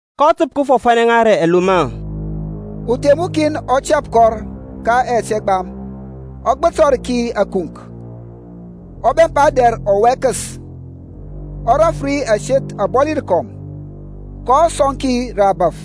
kɔ təp kəfɔfanɛ ŋa rə ɛlomɔ. Uthem ukin ɔ tɛp kɔr ka yɛt ɛgbam, ɔ gbətɔr ki ȧkunk, ɔ bɛmpa dɛr ɔwɛkəs, ɔ raf ri aseth abɔli rəkɔm, kɔ sɔŋ ki rə abȧf,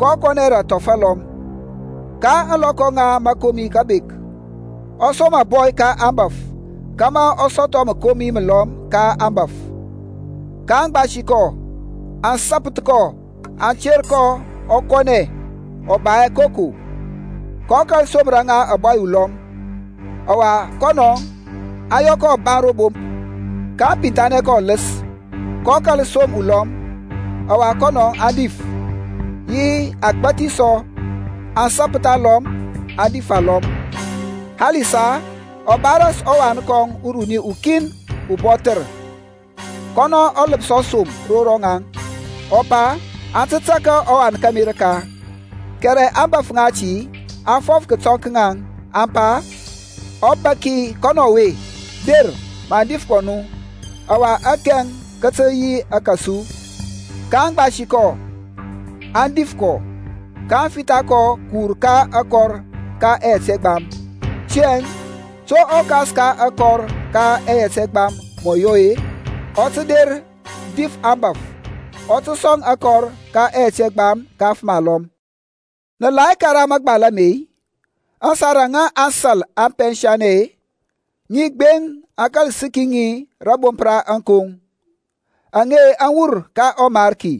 kɔ kɔnɛ rə athɔf alɔm. Ka ȧŋlɔkɔ ŋa mȧkomi kəbȧk, ɔ som ȧbɔy ka aŋbȧf kȧmȧ ɔ sɔthɔ məkomi məlɔm ka aŋbȧf. kaŋ gbasi kɔ, aŋ sapəth kɔ aŋ ter kɔ ɔ kɔnɛ ɔ ba hɛ koko. kɔ kȧl somər ŋa ȧbɔy ulɔm; ɔwa kɔnɔ, aŋ yɔ kɔ ɔbaŋ ro bomp, kaŋ pinthanɛ kɔ ɔləs. kɔ kȧl som ulɔm, ɔwa kɔnɔ aŋ dif, yi agbȧthi sɔ, aŋ sapəth alɔm, aŋ dif alɔm. Halisa, ɔ ba ras ɔwan kɔŋ uruni ukin ubɔthər. Kɔnɔ ɔ ləpsɔ som ro ŋaŋ, ɔ pa, Aŋ tə tȧrȧ ɔwan kȧmi rəka. Kɛrɛ aŋbȧf ŋati aŋ fɔf kətɔŋ ka ŋaŋ, aŋ pa, Ɔbaki kɔnɔ ɔwe, der maŋ dif kɔ nu, ɔwa akɛŋ kə tə yi ȧke su. kaŋ gbasi kɔ, aŋ dif kɔ, kaŋ fitha kɔ kəwur ka akɔr ka ɛyɛt ɛgbam. Tiyȧŋ, to ɔkas ka akɔr ka ɛyɛt ɛgbam mɔ yɔ-e? Ɔ tə der dif aŋbȧf ɔ tə sɔŋ akɔr ka ɛyɛt ɛgbam ka afəm alɔm. Nə la hɛ karaŋ mȧgbal ame-i? Aŋsar aŋa aŋsȧl aŋ pɛnsa-e, Ŋi gbeŋ a kȧl səki ŋi rȧbomp ra ȧŋkoŋ; Aŋe aŋ wur ka ɔMarki,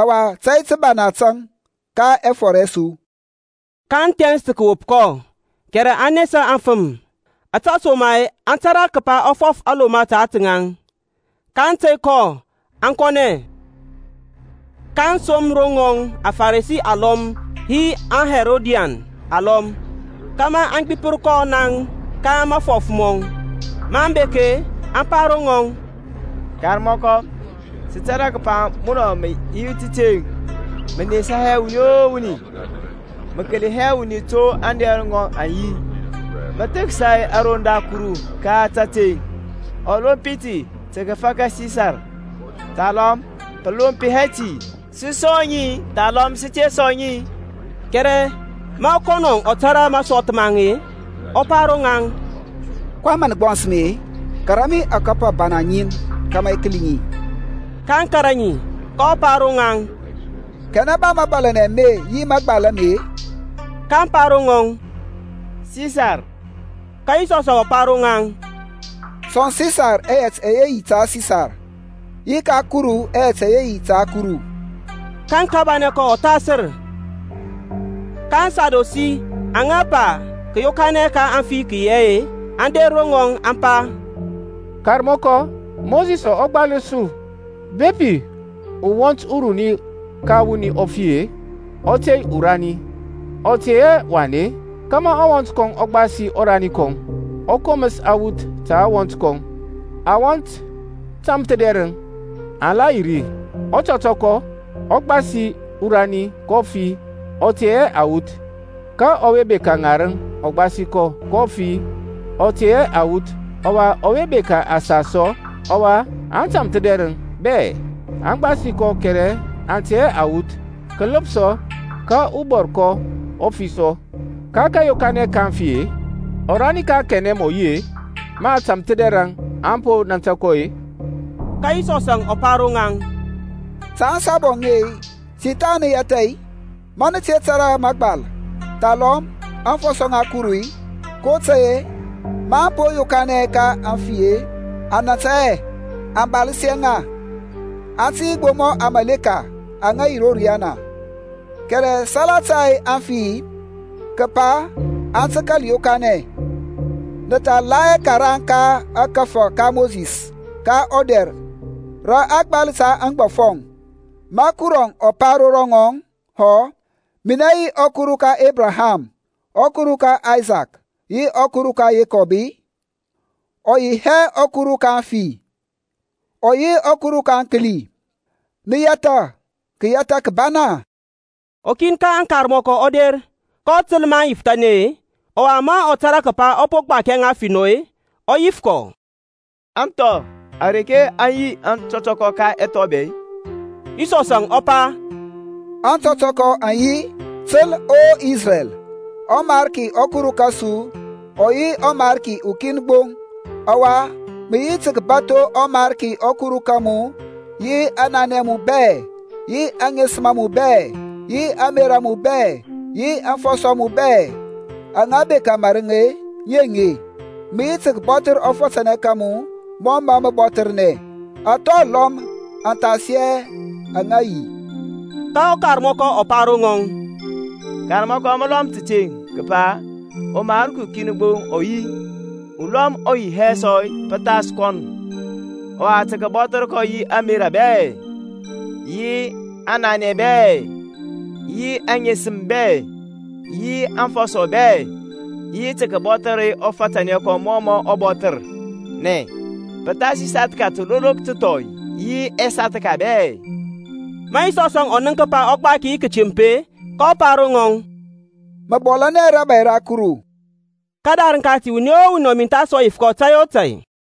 Ɔwa tȧy təkabanɛ tȧŋ ka ɛfɔr ɛ su. kaŋ thɛns tə kəwop kɔ, kɛrɛ aŋ nesa aŋfəm, ȧtesoma-e aŋ tȧrȧ kəpa ɔ fɔf aŋlomɔ ta ȧtȧ ŋaŋ. Kaŋ tey kɔ, aŋ kɔnɛ. kaŋ som ro ŋɔŋ aFaresi alɔm yi aHerodian alɔm, kȧmȧ aŋ gbipər kɔ naŋ ka mafɔf mɔŋ. Maŋ bek-e, aŋ pa ro ŋɔŋ, Karmɔkɔ sə tȧrȧ kəpa munɔŋ mə yi təteŋ, mə nesa hɛ wuni o wuni, mə kəli hɛ wuni to ȧŋdɛr ŋɔŋ aŋ yi, mə thəksa aroŋ da Kuru ka tȧteŋ. Ɔlompi ti tə kəfaka Sisarȧŋ, thalɔm pə lomp hɛ-i? Sə sɔŋ-i, thalɔm sə te sɔŋ-i? Kɛrɛ ma kɔnɔ ɔ tȧrȧ masɔth ma ŋaŋ-e, ɔ pa ro ŋaŋ, kɔyɛŋ mə nə gbɔns mi-e? Kara mi akɔpər abana ŋin kȧmȧ i kəli ŋi. kaŋ kȧrȧ ŋi. Kɔ pa ro ŋaŋ, Kanɛ ba mȧbȧlȧnɛ ame yi mȧgbal ame-e? kaŋ pa ro ŋɔŋ, Sisar. Ka Yisɔsȧŋ ɔ pa ro ŋaŋ, Sɔŋ Sisar ɛyɛt ɛyɛ yi ta Sisar, yi ka Kuru ɛyɛt ɛyɛ yi ta Kuru. Ka aŋ kabanɛ kɔ ɔthasər. Ka aŋSadusi aŋa pa kȧyokanɛ ka aŋfi kə yi hɛ-e, aŋ der ro ŋɔŋ aŋ pa, Karmɔkɔ, Mosisȧŋ ɔ gbalər su, Bepi ɔwɔnt uruni ka wuni ɔ fi-e, ɔ tey urani, ɔ tey hɛ wan-e, kȧmȧ ɔwɔnt kɔŋ ɔ gbasi ɔrani kɔŋ, ɔ koməs awuth ta ɔwɔnt kɔŋ. Awɔnt tȧmthədɛrəŋ aŋ la yi ri; ɔtɔtɔkɔ ɔ gbasi urani, kɔ fi, ɔ tey hɛ awuth. Ka ɔwe bekȧ ŋarəŋ ɔ gbasi kɔ, kɔ fi, ɔ tey hɛ awuth, ɔwa ɔwe bekȧ asas sɔ. Ɔwa aŋtam-thədɛrəŋ bɛ aŋ gbasi kɔ kɛrɛ aŋ tey hɛ awuth, kaləpsɔ ka ɔbɔrkɔ ɔ fi sɔ. Ka kȧyokanɛ ka aŋfi-e, ɔrani ka kanɛ mɔ yi-e, ma aŋtamthədɛrəŋ aŋ po nȧntȧ kɔ-e? Ka Yisɔsȧŋ ɔ pa ro ŋaŋ, Ta ȧŋsabu aŋe-e, ti tha nə yɛtha-i, ma nə te tȧrȧ mȧgbal, thalɔm aŋfɔsɔ ŋa Kuru-i? kotȧy-e maŋ po yokanɛ ka aŋfi-e, aŋ nȧntȧ hɛ, a baləs hɛ ŋa, aŋ tə yi gbo mɔ aŋmȧleka aŋa yi ro riyana. Kɛrɛ salata aŋfi-e, kəpa aŋ tə kȧl yokanɛ; nə tha la hɛ karaŋ ka ȧkȧfȧ ka Mosisȧŋ ka ɔdɛr rə a gbal ta aŋgbɔfɔŋ, ma Kurɔŋ ɔ pa ro ŋɔŋ hɔ, Minɛ yi ɔKuru ka Ebraham, ɔKuru ka Aysak yi ɔKuru ka Yekɔb-i? Ɔ yi hɛ ɔKuru ka aŋfi, ɔ yi ɔKuru ka aŋkəli. Nə yɛthȧ kəyɛtha kəbana. Ukin ka aŋkarmɔkɔ ɔ der, kɔ təl maŋ yifəthanɛ-e, ɔwa ma ɔ tȧrȧ kəpa ɔ po gbakia ŋa finɔ-e, ɔ yif kɔ, Athɔ areke aŋ yi aŋtɔtɔkɔ ka ɛthɔ bɛ-e? Yisɔsȧŋ ɔ pa, Aŋtɔtɔkɔ aŋ yi, Təl O Isrɛl, ɔMarki ɔKuru kȧsu ɔ yi ɔMarki ukin gbo; ɔwa mə yi tə kəbatho ɔMarki ɔKuru ka mu yi aŋnanɛ a mu bɛ, yi aŋesəm a mu bɛ, yi ȧŋmerȧ a mu bɛ, yi aŋfɔsɔ a mu bɛ. Aŋa bekȧ mȧrəŋ, ŋi aŋe; mə yi tə kəbɔthər ɔfȧtȧnɛ ka mu mɔ mȧ mə bɔthərnɛ. Athɔ alɔm athasi ɛye aŋ yi hɛ. Ka ɔkarmɔkɔ ɔ pa ro ŋɔŋ, Karmɔkɔ mə lɔm təteŋ kəpa ɔMarki ukin gbo ɔ yi, ulɔm ɔ yi hɛ sɔ pəthas kɔnɔŋ. Ɔwa tə kəbɔthər kɔ yi ȧŋmerȧ bɛ, yi aŋnanɛ bɛ, yi aŋesəm bɛ, yi aŋfɔsɔ bɛ, yi tə kəbɔthər ɔfatanɛ kɔŋ mɔ mɔ bɔthərnɛ, pə thasi sathka təlolok təthɔi yi ɛsathka bɛ. Ma Yisɔsȧŋ ɔ nənk kəpa ɔ gbaki yi kətemp-e kɔ pa ro ŋɔŋ, Mə bɔlȧnɛ hɛ rȧbȧy ra Kuru. Kədarəŋ kati wuni o wuni ɔ mintha hɛ sɔ yif kɔ tȧy o tȧy.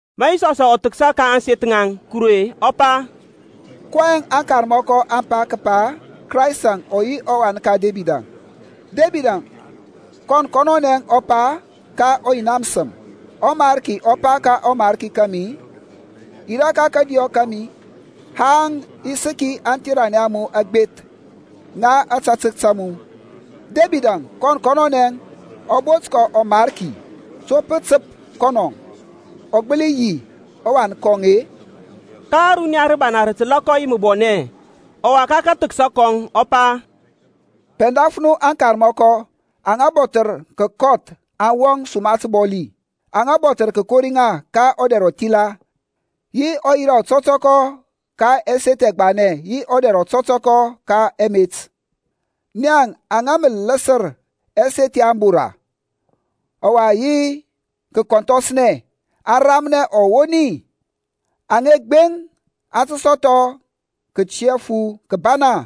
Ma Yisɔsȧŋ ɔ thəksa ka ȧŋseth ŋa Kuru-e, ɔ pa, kɔyɛŋ aŋkarmɔkɔ aŋ pa kəpa Kraystȧŋ ɔ yi ɔwan ka Debid-a? Debid kɔn kɔnɔnɛ ɔ pa ka ɔYina məsəm, ƆMariki ɔ pa ka ɔMarki kȧmi, Yirȧ ka kȧdiyɔ kȧmi Haŋ i səki aŋtheranɛ a mu agbeth ŋa ȧtȧtək ta mu. Debidȧŋ kɔn kɔnɔnɛ ɔ bont kɔ Mariki; to pə təp kɔnɔ ɔ gbəli yi ɔwan kɔŋ-e? Ka ȧruniya rəbana rə təlȧ kɔ yi məbɔnɛ. Ɔwa ka kathəksa kɔŋ ɔ pa, Pɛndaf nu aŋkarmɔkɔ aŋa bɔthər kəkɔth aŋ wɔŋ suma təbɔli, aŋa bɔthər kəkori ŋa ka ɔdɛr ɔthila, yi ɔyira ɔtɔtɔkɔ ka ɛseth ɛgbanɛ yi ɔdɛr ɔtɔtɔkɔ ka ɛmet. Ŋaŋ aŋa mə ləsər ɛseth ya abora, ɔwa yi kəkɔnthɔsnɛ aŋ ramnɛ ɔwoni; aŋe gbeŋ aŋ tə sɔthɔ kətiyafu kəbana.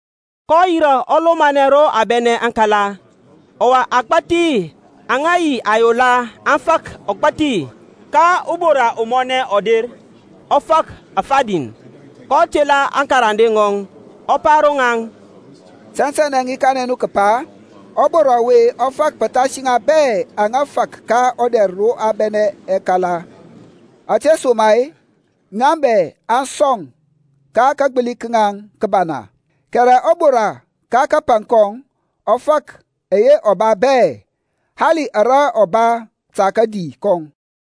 kɔ yirȧ ɔ lomanɛ ro a bɛnɛ aŋkala, ɔwa agbȧthi aŋa yi ayola aŋ fak ɔgbȧthi. Ka ubora umɔnɛ ɔ der, kɔ fak afadin. kɔ tela aŋkarande ŋɔŋ, ɔ pa ro ŋaŋ, Tɛntɛnɛ i kanɛ nu kəpa, ɔbora ɔwe ɔ fak pəthasi ŋa bɛ aŋa fak ka ɔdɛr ro a bɛnɛ aŋkala; ȧtesoma-e ŋa bɛ aŋ sɔŋ ka kagbəli ka ŋaŋ kəbana, kɛrɛ ɔbora ka kapaŋ kɔŋ ɔ fak ɛyɛ ɔ ba bɛ, hali ara ɔ ba ta kadi kɔŋ.